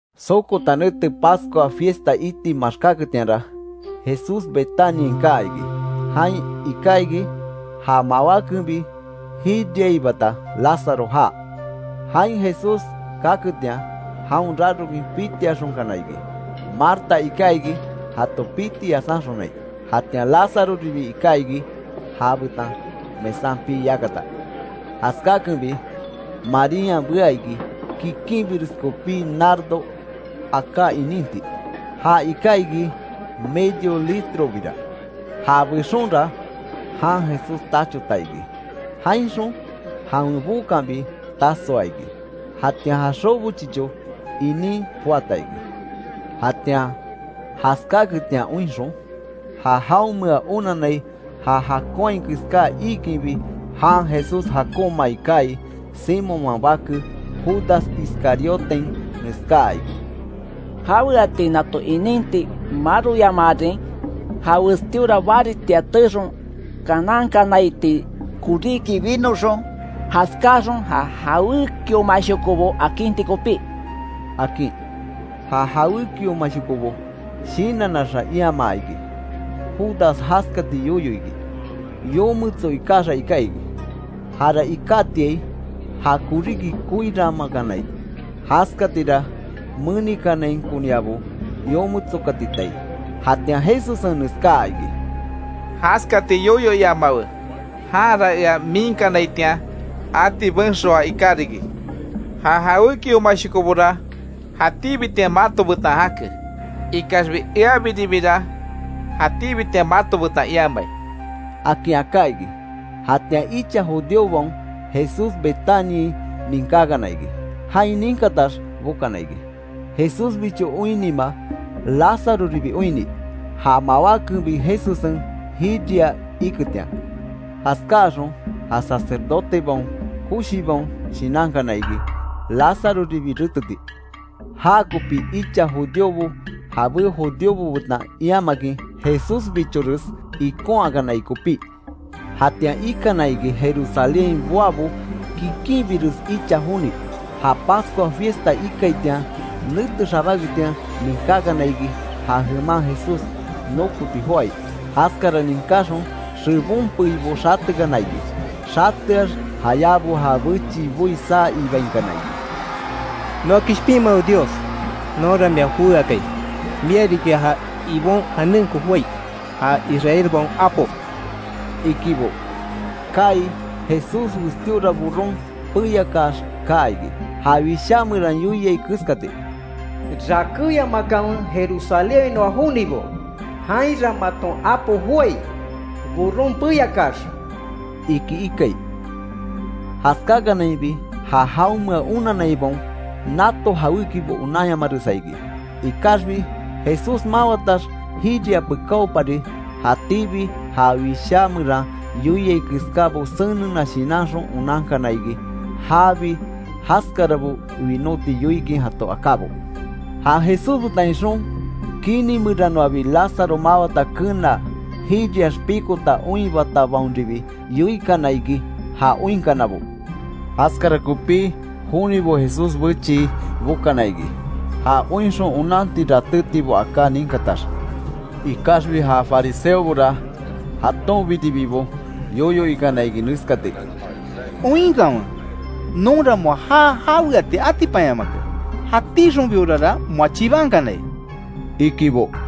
Sokota nete Pascua fiesta iti maxkáketianra, Jesús Betaniain kaa iki. Jain iká iki, ja mawákenbi jiriaibata Lazaro jaa. Jain Jesús kaketian jaon rarokin pitiaxonkana iki, Marta iká iki jato piti yasanxonai. Jatian Lázaroribi iká iki ja betan mesan pii yakata. Jaskakenbi, Marían bea iki kikinbires kopí nardo aká ininti. Ja iká iki medio litrobira. Ja bexonra jan Jesús tachota iki. Jainxon jawen bookanbi tasoa iki. Jatian ja xobo chicho inin poata iki. Jatian jaskáaketian oinxon, ja jaonmea onanai ja jakonhai keská iikinbi jan Jesús jakonmaai kaai, Simonman bake, Judas Iscarioten neskaa iki: —¿Jaweati nato ininti maroyamaarin, ja westíora baritia teexon kanankanaitii koríki binoxon, jaskáaxon ja jawékiomashokobo akinti kopí? —akin. Ja jawékiomashokobo shinannaxa iamaa iki Judas jaskati yoyo iki, yometso ikaxa iká iki. Jara ikátiai, ja koríki koiranmakanai, jaskatira menikanainkoniabo yometsokatitai. Jatian Jesussen neskaa iki: —Jaskati yoyo iamawe. Janra ea miinkanaitian ati benxoa iká riki. Ja jawékiomashokobora jatíbitian mato betan jake, ikaxbi eabiribira jatíbitian mato betan iamai —akin aká iki. Jatian icha judíobaon Jesús Betaniain ninkákana iki, jain ninkatax bokana iki Jesúsbicho oinnima Lázaroribi oinni; ja mawákenbi Jesussen jiriaa iketian. Jaskáaxon ja sacerdotebaon koshibaon shinankana iki, Lázaroribi reteti. Já kopi icha judíobo jabé judíobo betan iamakin Jesúsbichores ikonhakanai kopí. Jatian ikana iki Jerusalénhain boabo kikinbires icha joni, ja Pascua fiesta ikaitian, nete xabáketian ninkákana iki ja jeman Jesús nokoti joái. Jaskara ninkaxon xebon peibo xatekana iki, xateax jayábo ja bechii boi saa ibainkana iki: —¡Noa Kishpinmawe Dios! ¡Nonra mia jowé akai, mia riki ja Ibon janenko joái, ja Israelbaon Apo! —ikibo. Kaai Jesús westíora burron peyakax kaa iki, ja wishá meran yoiai keskati: “Rakéyamakanwe Jerusalénhainoa jonibo, jainra maton apo joái; burron peyakaax”, iki ikai. Jaskákanainbi ja jaonmea onanaibaon nato jawékibo onanyamaresa iki. Ikaxbi Jesús mawatax jiria pekáopari jatíbi ja Wishá meran yoiai keskábo senena shinanxon onankana iki jaabi jaskarabo winóti yoikin jato akábo. Ja Jesús betan ixon, kini meranoabi Lazaro mawata kenaa, jiriax pikota oinhibatabaonribi, yoikana iki ja oinkanabo. Jaskara kopí jonibo Jesús bechii bokana iki, ja oinxon onanti ratétibo aká ninkatax. Ikaxbi ja fariseobora jatonbiribibo yoyo ikana iki neskati: —Oinkanwe nonra moa já jaweati atipanyamake, ¡Jatíxonbiorara moa chibankanai! —ikibo.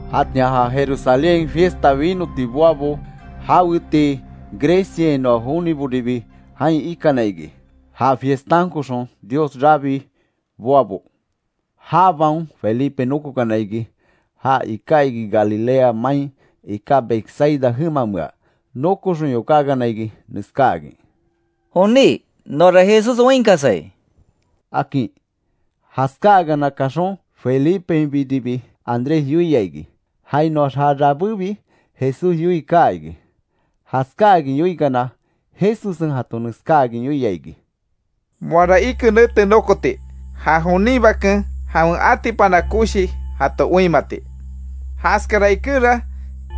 Jatian ja Jerusalénhain fiesta winoti boabo jawetii Greciainoa joniboribi jain ikana iki, ja fiestankoxon Dios rabii boabo. Jabaon Felipe nókokana iki. Ja iká iki Galilea main iká Betsaida jemamea, nokoxon yokákana iki, neskáakin: —Joní, noara Jesús oinkasai —akin. Jaskáakana kaxon, Felipenbiribi Andrés yoia iki. Jainoax ja rabébi Jesús yoii kaa iki. Jaskáakin yoikana, Jesussen jato neskáakin yoia iki: —Moara ike nete nokoti, ja jonin Baken jawen atipana koshi jato oinmati. Jaskara ikenra,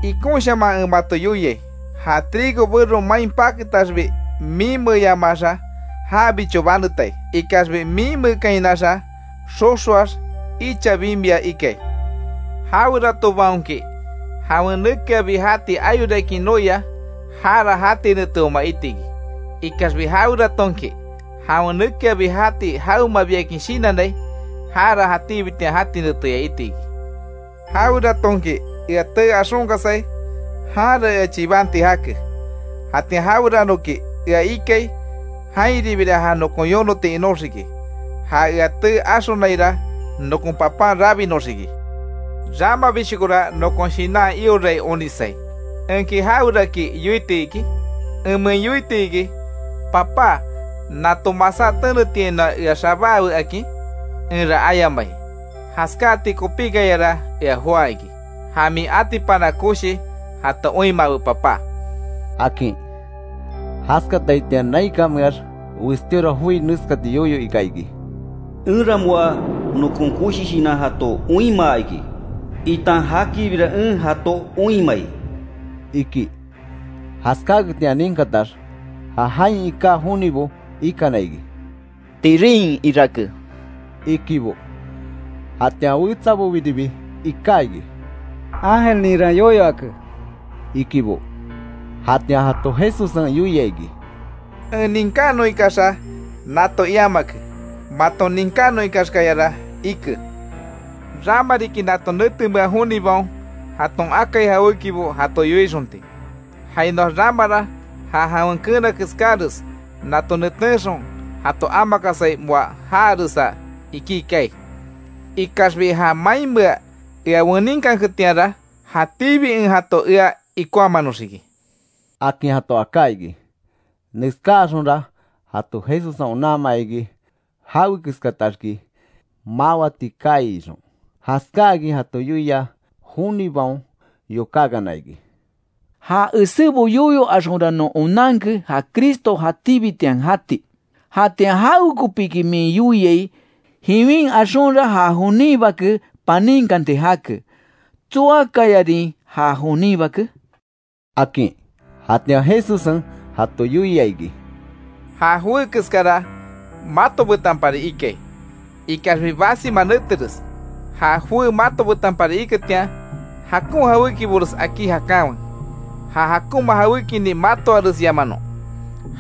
ikonshaman en mato yoiai, ja trigo bero main paketaxbi miinmeeyamaxa jabicho banetai, ikaxbi miinmeekainaxa, xoxoax icha bimia ikai. Jaweratobaonki jawen nekeabi jati ayorakin noia, jara jati neteoma itiki. Ikaxbi jaweratonki jawen nekeabi jati jawemabiakin shinannai, jara jatíbitian jati neteya itiki. Jaweratonki ea tee axonkasai, janra ea chibanti jake, jatian jaweranoki ea ikai, jainribira ja nokon yonoti inóxiki, ja ea tee axonaira nokon Papan rabinoxiki. ¡Ramabishokora nokon shinan iorai onisai! ¿Enki jaweraki yoiti iki?, ¿Enmein yoitiki: Papá, nato masá tenetiainoa ea xabaawe akin? Enra ayamai. ¡Jaskáti kopíkayara ea joá iki! Ja min atipana koshi jato oinmawe Papá —akin. Jaskataitian naikanmeax westíora joi neskati yoyo ika iki: “Enra moa nokon koshi shinan jato oinmaa iki, itan jakiribira en jato oinmai”, iki. Jaskaketian ninkatax, ja jain iká jonibo ikana iki: —Tirín irake —ikibo. Jatian wetsabobiribi iká iki: —Ángelninra yoyo ake —ikibo. Jatian jato Jesussen yoia iki: —En ninkanon ikaxa nato iamake, maton ninkanon ikaxkayara ike. Rama riki nato netemea jonibaon jaton akai jawékibo jato yoixonti, jainoax ramara ja jawen keena keskáres nato netenxon jato amakasai moa jaaresa ikí kaai. Ikaxbi ja mainmea ea weninkanketianra, jatíbi en jato ea ikonhamanoxiki —akin jato aká iki. Neskáaxonra jato Jesussen onanmaa iki, jawekeskataxki mawati kaai ixon. Jaskáakin jato yoia jonibaon yokákana iki: —Ja esébo yoyo axonra non onanke ja Cristo jatíbitian jati. ¿Jatian jawekopiki min yoiai, jiwin axonra ja jonin Bake paninkanti jake? ¿Tsoakayarin ja jonin Bake? —akin. Jatian Jesussen jato yoia iki: —Ja joé keskara mato betanpari ikai, ikaxbi basima neteres, ja joé mato betanpari iketian, jakon jawékibores akí jakanwe, ja jakonma jawékinin matoaresyamanon.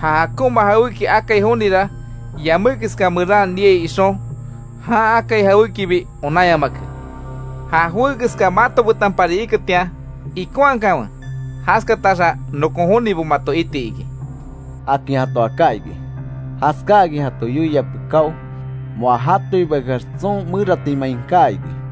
Ja jakonma jawéki akai jonira, yamé keska meran niai ixon, jan akai jawékibi onanyamake. Ja joé keska mato betanbipari iketian ikonhakanwe, jaskataxa nokon jonibo mato iti iki —akin jato aká iki. Jaskáakin jato yoia pekáo, moa jatoibakeax tson meratimain kaa iki.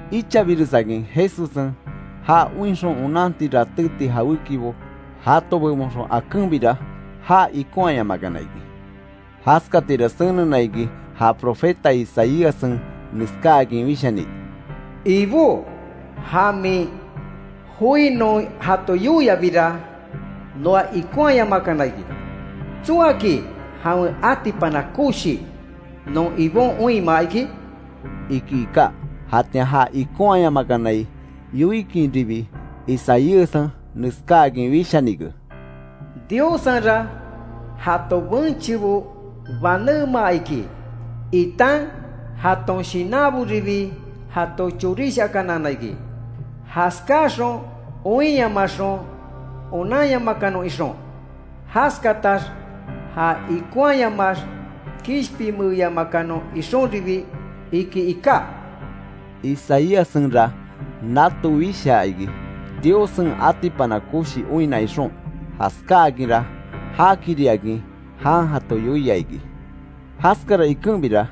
Ichabiresakin Jesussen ja oinxon onanti ratéti jawékibo jato bebonxon akenbira, já ikonhayamakana iki. Jaskatira senena iki, ja profeta Isaíassen neskáakin wishani: “Ibó, ja min joi non jato yoiabira noa ikonhaayamakana iki. ¿Tsoaki jawen atipana koshi, non Ibon oinmaa iki?” iki iká. Jatian ja ikonhaayamakanai yoikinribi, Isaíassen neskáakin wishanike: “Diossenra jato benchebo banémaa iki, itan jaton shinanboribi jato chorishakanaana iki, jaskáaxon oinyamaxon onanyamakanon ixon, jaskatax ja ikonhayamax kishpinmeeyamakanon ixonribi”, iki iká. Isaíassenra nato wishaa iki, Diossen atipana koshi oinna ixon, jaskáakinra jakiriakin jan jato yoia iki. Jaskara ikenbira,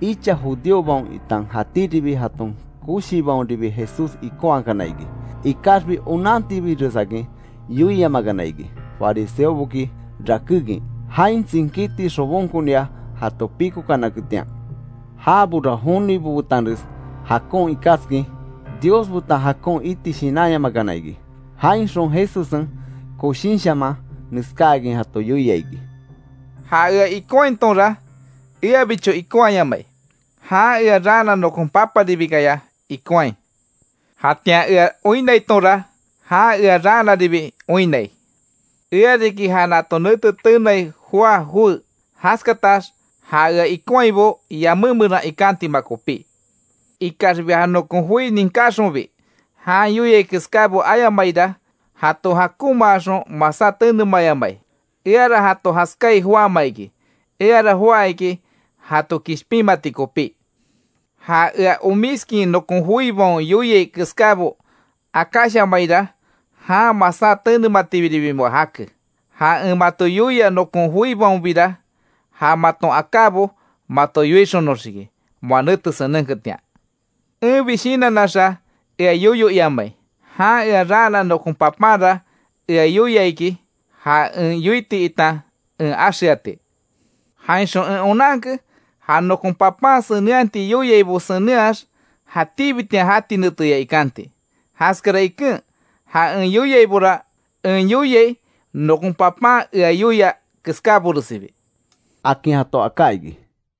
icha judíobaon itan jatíribi jaton koshibaonribi Jesús ikonhakana iki. Ikaxbi onantibiresakin yoiamakana iki, fariseoboki rakékin, jain tsinkíti xobonkonia jato píkokanaketian. Jabora jonibo betanres jakon ikaskin, Dios betan jakon iti shinanyamakana iki. Jainxon Jesussen koshinshaman neskáakin jato yoia iki: “Ja Ea ikonhaitonra, eabicho ikonhayamai, jan ea raana nokon Paparibikaya ikonhai. Jatian ea oinnaitonra, jan ea raanaribi oinnai. Ea riki ja nato nete tenai joá joé, jaskatax ja ea ikonhaibo yamé meran ikantima kopí. Ikaxbi ja nokon joibo ninkataxonbi jan yoiai keskábo ayamaira, jato jakonmaaxon masá tenemayamai, eara jato jaskai joáma iki. Eara joá iki jato kishpinmati kopí. Ja ea omiskin nokon joibaon yoiai keskábo akáshamaira, jan masá tenematibiribi moa jake. Ja en mato yoia nokon joibaonbira, ja maton akábo mato yoixonoxiki, moa nete senenketian. Enbi shinannaxa ea yoyo iamai. Jan ea raana nokon Papanra ea yoia iki, ja en yoiti itan en axeati. Jainxon en onanke, ja nokon Papán senenhati yoiaibo senenhax jatíbitian jati neteya ikanti. Jaskara iken ja en yoiaibora en yoiai, nokon Papan ea yoia keskáboresibi”, akin jato aká iki.